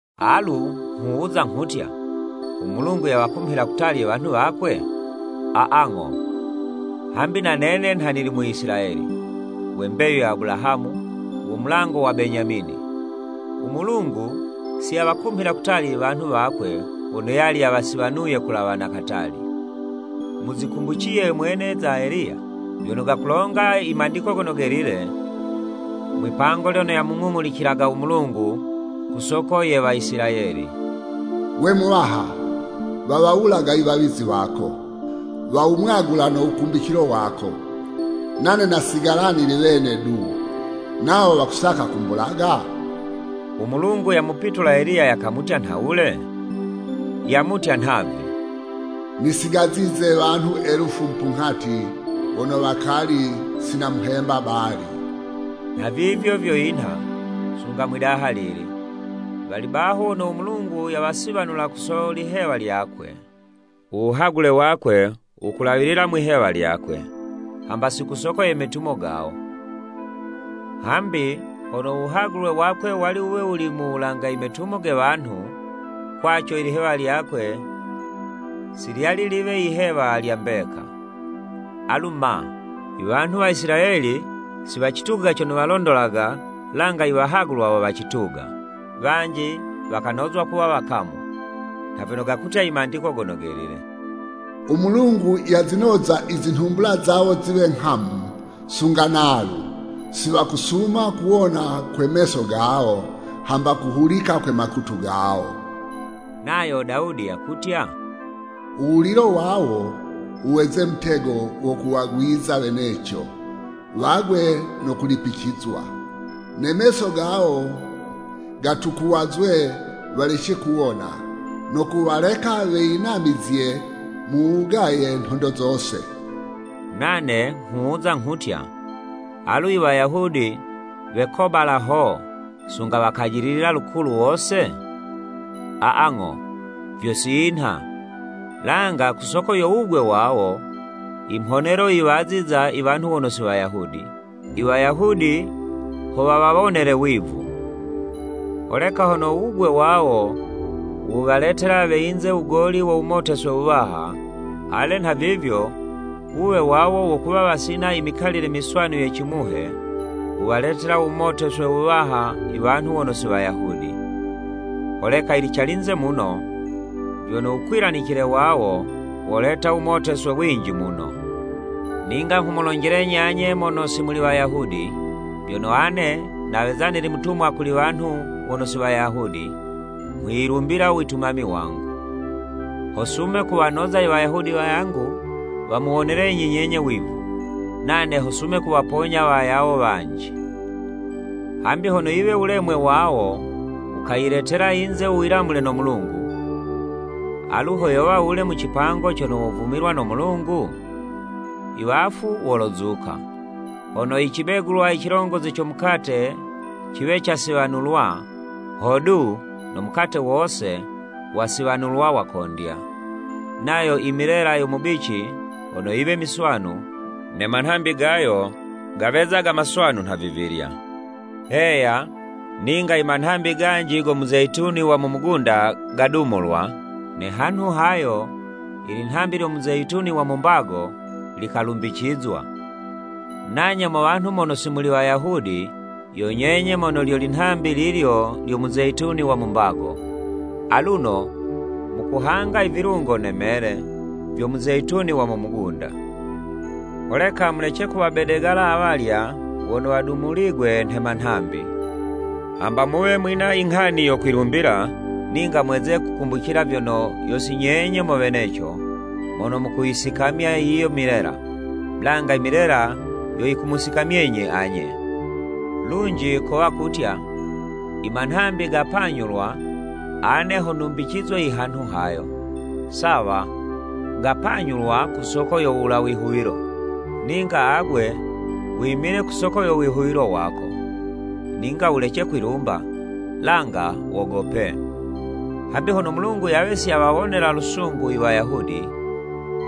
Alu nghuwuza nghutya, u Mulungu yawakumhila kutali iwanhu wakwe? Aa, ng'o. Hambi na nene nha nili Muisilayeli, we mbeyu ya Abulahamu, wo mulango wa Benyamini. U Mulungu si yawakumhila kutali iwanhu wakwe wono yali yawasiwanuye kulawa na katali. Muzikumbuciye mwene za Eliya, vyono gakulonga i Mandiko Gono Gelile, mwipango lyono yamung'ung'ulicilaga u Mulungu, ku soko ye Waisilayeli. “Gwe Muwaha, wawawulaga iwawizi wako, wawumwagula no wukumbicilo wako. Nane nasigala nili wene du, nawo wakusaka kumbulaga?” U Mulungu yamupitula Eliya yakamutya nhawule? Yamutya nhavi, “Nisigazize wanhu elufu mupunghati, wono wakali si namuhemba Baali.” Nhavivyo vyo yinha, sunga mwi'daha lili, wali baho wono u Mulungu yawasiwanula ku so lihewa lyakwe. U wuhagule wakwe wukulawilila mwi'hewa lyakwe, hamba si ku soko ye metumo gawo. Hambi hono u wuhagulwe wakwe wali wuwe wuli mu wulanga imetumo ge wanhu, kwaco ilihewa lyakwe si lyali liwe yihewa lya mbeka. Alu ma? Iwanhu wa Isilayeli, si wacituga cono walondolaga, langa iwahagulwa wo wacituga. Wanji wakanozwa kuwa wakamu. Nha vyono gakutya i Mandiko Gono Gelile. “U Mulungu yazinoza izinhumbula zawo ziwe nghamu, Sunga nalu, si wakusuma kuwona kwe meso gawo. Hamba kuhulika kwe makutu gawo.” Nayo Dawudi yakutya, “U wulilo wawo wuweze mutego wo kuwagwiza weneco, wagwe no kulipicizwa. Ne meso gawo gatukuwazwe, walece kuwona. No kuwaleka weyinamizye mu wugaye nhondo zose!” Nane nghuwuza nghutya, alu i Wayahudi wekobala ho, sunga wakajililila lukulu wose? Aa, ng'o, vyo si vinha! Langa ku soko yo wugwe wawo, imhonelo yiwaziza i wanhu wono si Wayahudi, i Wayahudi ho wawawonele wivu. Holeka hono u wugwe wawo, wuwaletela we yinze wugoli wo wumoteswe wuwaha, ale nhavivyo wuwe wawo wo kuwa wasina i mikalile miswanu ye cimuhe, wuwaletela wumoteswe wuwaha iwanhu wono si Wayahudi. Holeka yili calinze muno, vyono wukwilanicile wawo, woleta uwumoteswe winji muno. Ninga nghumulonjelenyi anye mono si muli Wayahudi, Vyono ane naweza nili mutumwa kuli wanhu wono si Wayahudi, nghwiyilumbila u witumami wangu, ho sume kuwanoza i Wayahudi wayangu, wamuwonelenyi nyenye wivu, nane ho sume kuwaponya wayawo wanji. Hambi hono yiwe u wulemwe wawo wukayiletela iyinze u wilamule no Mulungu, alu ho yowa wule mu cipango cono wovumililwa no Mulungu? Iwafu wolozuka! Hono i cibegulwa cilongozi co mukate ciwe casiwanulwa, hodu, no mukate wose wasiwanulwa wakondya; nayo imilela yo mubici hono yiwe miswanu, ne manhambi gayo gawezaga maswanu nhavivilya. Heya, ninga imanhambi ganji go muzeyituni wa mu mugunda gadumulwa, ne hanhu hayo, ilinhambi lyo muzeyituni wa mu mbago likalumbicizwa. Nanye mo wanhu mono si muli Wayahudi, yo nyenye mono lyo linhambi lilyo lyo muzeyituni wa mu mbago, aluno mukuhanga ivilungo ne mele, vyo muzeyituni wa mu mugunda. Holeka mulece kuwabedegala awalya wono wadumuligwe nhe manhambi! Hamba muwe mwina inghani yo kwilumbila, ninga mweze kukumbucila vyono, yo si nyenye mo weneco, mono mukuyisikamya yiyo imilela, langa imilela yo yikumusikamyenyi anye. Lunji kowa kutya, “I manhambi gapanyulwa, ane ho numbicizwe i hanhu hayo.” Sawa, gapanyulwa ku soko yo wula wihuwilo, ninga agwe wimile ku soko yo wihuwilo wako. Ninga wulece kwilumba, langa wogope. Hambi hono u Mulungu yawe si yawawonela lusungu i Wayahudi,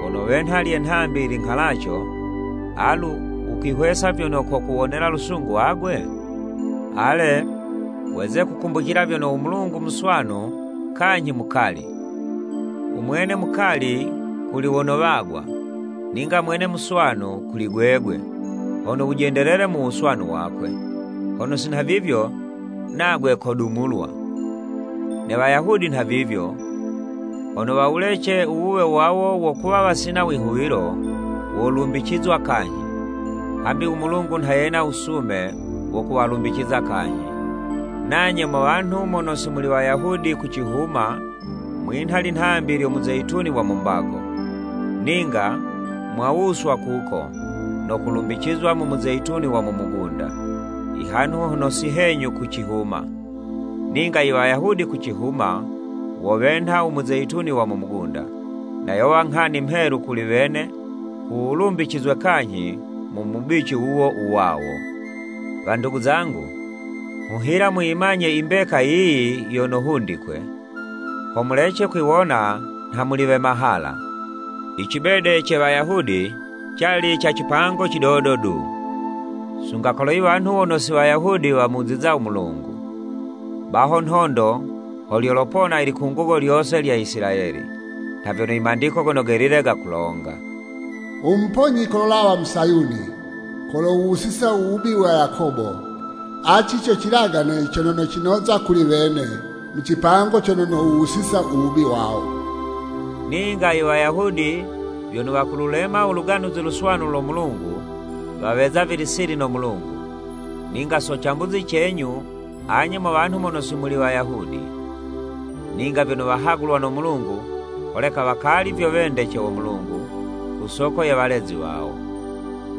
wono wenha lye nhambi linghalaco, alu wukwihwesa vyono kokuwonela lusungu agwe? Ale, weze kukumbucila vyono, u Mulungu muswanu kanyhi mukali. U mwene mukali kuli wono wagwa, ninga mwene muswanu kuli gwegwe, hono wujendelele mu wuswanu wakwe, hono si nhavivyo, nagwe kodumulwa. Ne Wayahudi nhavivyo, hono wawulece u wuwe wawo wo kuwa wasina wihuwilo, wolumbicizwa kanyhi. Hambi u Mulungu nha yena wusume wo kuwalumbiciza kanyhi. Nanye mo wanhu mono si muli Wayahudi ku cihuma, mwinha linhambi lyo muzeyituni wa mu mbago, ninga mwawuswa kuko, no kulumbicizwa mu muzeyituni wa mu mugunda, i hanhu hono si henyu ku cihuma. Ninga i Wayahudi ku cihuma, wo wenha u muzeyituni wa mu mugunda, na yowa nghani mhelu kuli wene, ku wulumbicizwe kanyhi mu mubici wuwo u wawo. Wandugu zangu, nghuhila muyimanye imbeka yiyi yono hundikwe, ho mulece kwiwona nha muli we mahala. I cibede ce Wayahudi, cali ca cipango cidodo du, sunga kolo iwanhu wono si Wayahudi wamuziza u Mulungu. Baho nhondo ho lyopona ilikungugo lyose lya Isilayeli, nha vyono i Mandiko Gono Gelile gakulonga. “U Muponyi kololawa mu Sayuni Kolowuwusa u wubi wa Yakobo. Aci co cilagane cono nocinoza kuli wene Mu cipango cono nowuwusiza u wubi wawo.” Ninga i Wayahudi, vyono wakululema u Luganuzi Luswanu lo Mulungu, waweza vili sili no Mulungu, ninga so cambuzi cenyu anye mo wanhu mono si muli Wayahudi. Ninga vyono wahagulwa no Mulungu, holeka wakali vyo wendece wo Mulungu ku soko ye walezi wawo.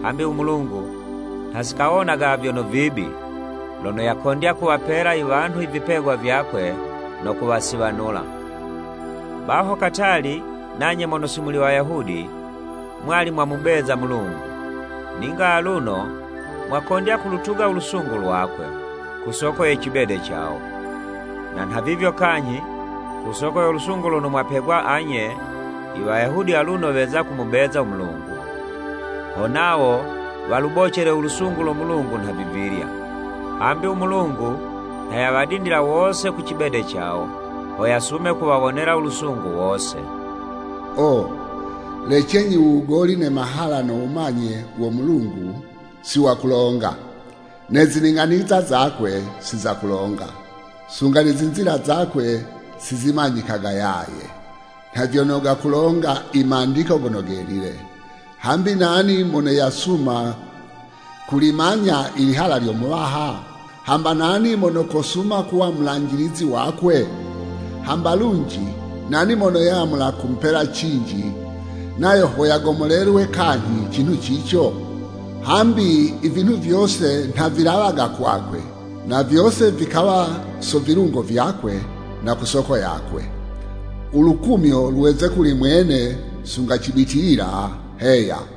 Hambi u Mulungu, nha si kawonaga vyono vibi, lono yakondya kuwapela iwanhu ivipegwa vyakwe no kuwasiwanula. Baho katali, nanye mono si muli Wayahudi mwali mwamubeza u Mulungu, ninga aluno mwakondya kulutuga u lusungu lwakwe, ku soko ye cibede cawo. Na nhavivyo kanyhi, ku soko yo lusungu lono mwapegwa anye, i Wayahudi aluno weza kumubeza u Mulungu, ho nawo walubocele u lusungu lo Mulungu nhavivilya. Hambi u Mulungu nha yawadindila wose ku cibede cawo, ho yasume kuwawonela u lusungu wose. O, lecenyi u wugoli ne mahala no wumanye wo Mulungu, si wakulonga! Ne zining'aniza zakwe si za kulonga! Sunga ne zinzila zakwe si zimanyikaga yaye. Nha vyono gakulonga i Mandiko Gono Gelile. “Hambi nani mono yasuma kulimanya i lihala lyo Muwaha? Hamba nani mono kosuma kuwa mulanjilizi wakwe? Hamba lunji nani mono yamula kumupela cinji, nayo ho yagomolelwe kanyhi cinhu cico?” Hambi i vinhu vyose nha vilawaga kwakwe, na vyose vikawa so vilungo vyakwe, na ku soko yakwe. U lukumyo lweze kuli mwene sunga cibitilila! Heya.